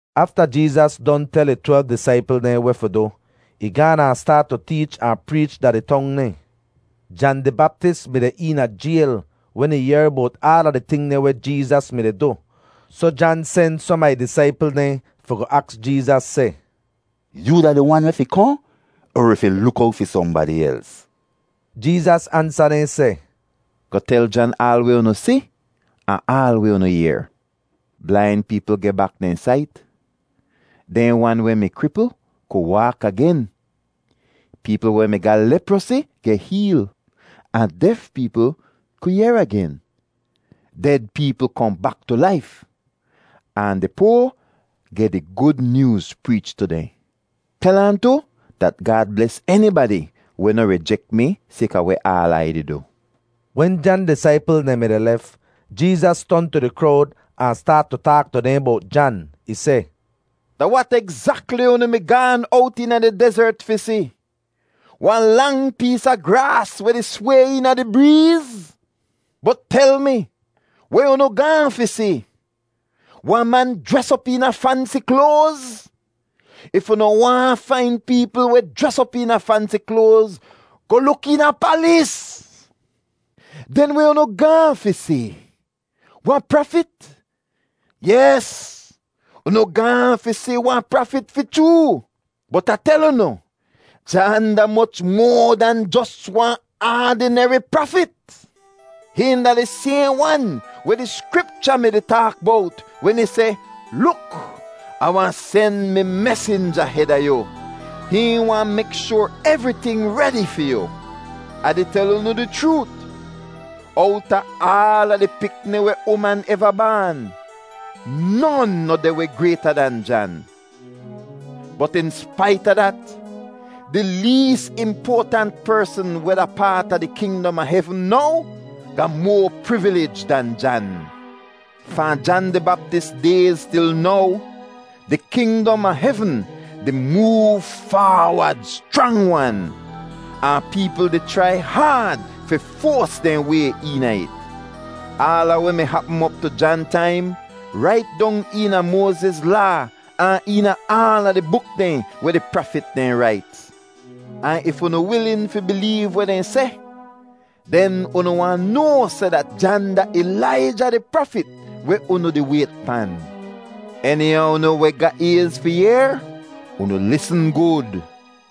Afta Jeezas don tel ih twelv disaipl dehn weh fi du, ih gaan ahn staat tu teech ahn preech da di tong dehn. Jan di Baptis mi deh eena jayl wen ih yehr bowt aala di ting dehn weh Jeezas mi-di du. Soh Jan sen som a ih disaipl dehn fi goh aks Jeezas seh, “Yoo da di Wan weh fi kohn, er wi fi luk owt fi sohnbadi els?” Jeezas ansa dehn seh, “Goh tel Jan aal weh unu si ahn aal weh unu yehr: Blain peepl geh bak dehn sait, dehn wan weh mi kripl ku waak agen, peepl weh mi ga leprosi geh heel, ahn def peepl ku yehr agen. Ded peepl kohn bak tu laif, ahn di poa geh di Gud Nyooz preech tu dehn. Tel ahn tu dat Gaad bles enibadi weh noh rijek mi sayka weh aal Ai di du.” Wen Jan disaipl dehn mi-di lef, Jeezas ton tu di krowd ahn staat tu taak tu dehn bowt Jan. Ih seh, “Da wat egzakli unu mi gaan owt eena di dezert fi si? Wahn lang pees a graas weh di sway eena di breez? Bot tel mi, weh unu gaahn fi si? Wahn man jres op eena fansi kloaz? If unu waahn fain peepl weh jres op eena fansi kloaz, goh luk eena palis. Den weh unu gaahn fi si? Wahn prafit? Yes, unu gaahn fi si wahn prafit fi chroo, bot Ah tel unu, Jan da moch moa dahn jos wahn aadineri prafit. Hihn da di sayhn wan weh di Skripcha mi-di taak bowt wen ih seh, ‘Luk, Ah wahn sen mi mesinja heda yu. Hihn wahn mek shoar evriting redi fi yu.’ Ah di tel unu di chroot, owta aala di pikni weh uman eva baan, non noh deh weh grayta dan Jan; bot in spait a dat, di lees impoatant persn weh da paat a di kingdom a hevn now, ga moa privilij dan Jan. Fahn Jan di Baptis dayz til now, di kingdom a hevn di moov faawod schrang-wan, ahn peepl di chrai haad fi foas dehn way eena it. Aala weh mi hapm op tu Jan taim rait dong eena Moaziz Laa ahn eena aala di buk dehn weh di prafit dehn rait. Ahn if unu wilin fi bileev weh dehn seh, den unu wahn noa seh dat Jan da Ilaija di prafit weh unu di wayt pan. Eni a unu weh ga ayz fi yehr, unu lisn gud!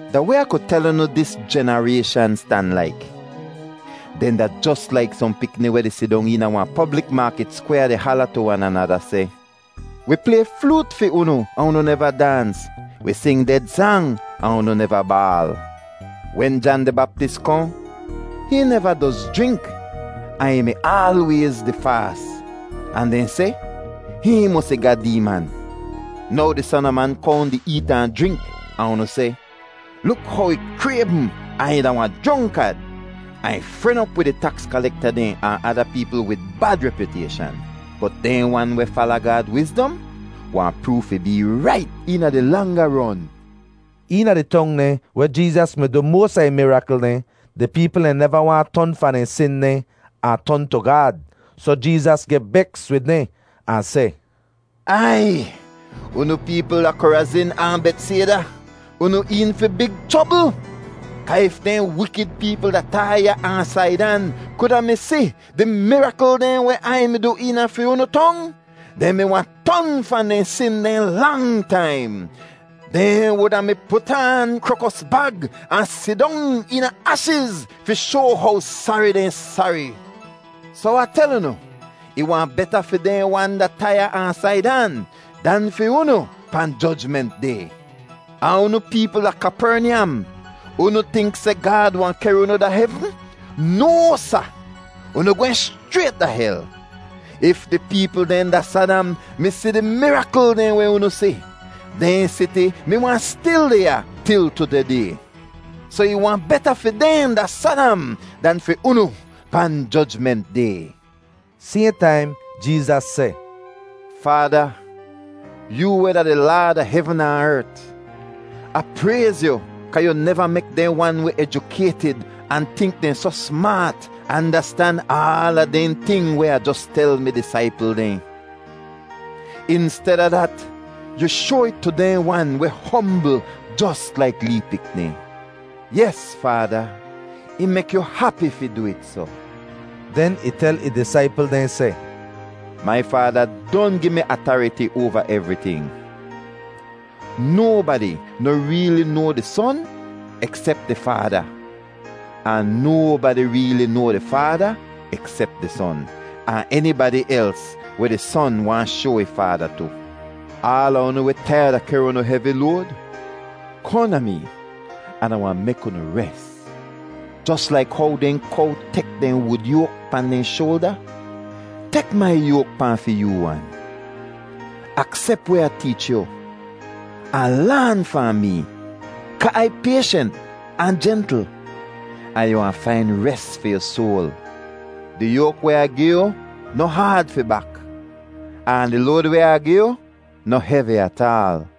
“Da weh Ah ku tel unu dis jenarayshan stan laik? Dehn da jos laik sohn pikni weh di sidong eena wahn poblik maakit skwyaa di hala tu wan anada seh, ‘Wi play floot fi unu ahn unu neva daans. Wi sing ded sang ahn unu neva baal.’ Wen Jan di Baptis kohn, hihn neva doz jrink ahn ih mi aalwayz di faas, ahn dehn seh, ‘Hihn mosi ga deeman.’ Now di Son a Man kohn di eet ahn jrink, ahn unu seh, ‘Luk how ih kraybm ahn ih da wahn jronkad, ahn ih fren op wid di taks kalekta dehn ahn ada peepl wid bad repyutayshan.’ Bot dehn wan weh fala Gaad wizdom wahn proov fi bee rait eena di langa ron.” Eena di tong dehn weh Jeezas mi du moas a ih mirakl dehn, di peepl dehn neva waahn ton fahn dehn sin dehn ahn ton tu Gaad. Soh Jeezas geh beks wid dehn ahn seh, “Aiy, unu peepl da Korazin ahn Betsayda, unu een fi big chrobl. Kaa if dehn wikid peepl da Taiya ahn Saidan kuda mi si di mirakl dehn weh Ai mi du eena fi unu tong, dehn mi wahn ton fahn dehn sin dehn lang taim. Dehn wuda mi put aan krokos bag ahn sidong eena ashiz fi shoa how sari dehn sari. Soh Ah tel unu, ih wahn beta fi dehn wan da Taiya ahn Saidan dan fi unu pahn Jojment Day. Ahn unu peepl da Kapernyam, unu tink seh Gaad wahn kehr unu da hevn? No, sa! Unu gwehn schrayt da hel! If di peepl dehn da Sadam mi si di mirakl dehn weh unu si, dehn siti mi wahn stil deh ya til tudeh day. Soh ih wahn beta fi dehn da Sadam dan fi unu pahn Jojment Day.” Sayhn taim Jeezas seh, “Faada, yoo weh da di Laad a hevn ahn ert, Ah prayz yu kaa yu neva mek dehn wan weh ejukaytid ahn tink dehn soh smaat andastan aala dehn ting weh Ah jos tel mi disaipl dehn. Insteda dat, yu shoa it tu dehn wan weh hombl jos laik lee pikni. Yes Faada, ih mek yu hapi fi du it soh.” Den ih tel ih disaipl dehn seh, “Mai Faada don gi mi atariti oava evriting. Nobadi noh reeli noa di Son eksep di Faada, ahn nobadi reeli noa di Faada eksep di Son, ahn enibadi els weh di Son waahn shoa ih Faada tu. “Aala unu weh taiyad a kehr unu hevi load, kohn da mee an Ah wahn mek unu res. Jos laik how dehn kow tek dehn wud yoak pahn dehn shoalda, tek mai yoak pahn fi yoo wan. Aksep weh Ah teech yu, ahn laan fahn mee kaa Ai payshent ahn jentl, ahn yu wahn fain res fi yu soal. Di yoak weh Ah gi yu noh haad fi bak, ahn di load weh Ah gi yu noh hevi ataal.”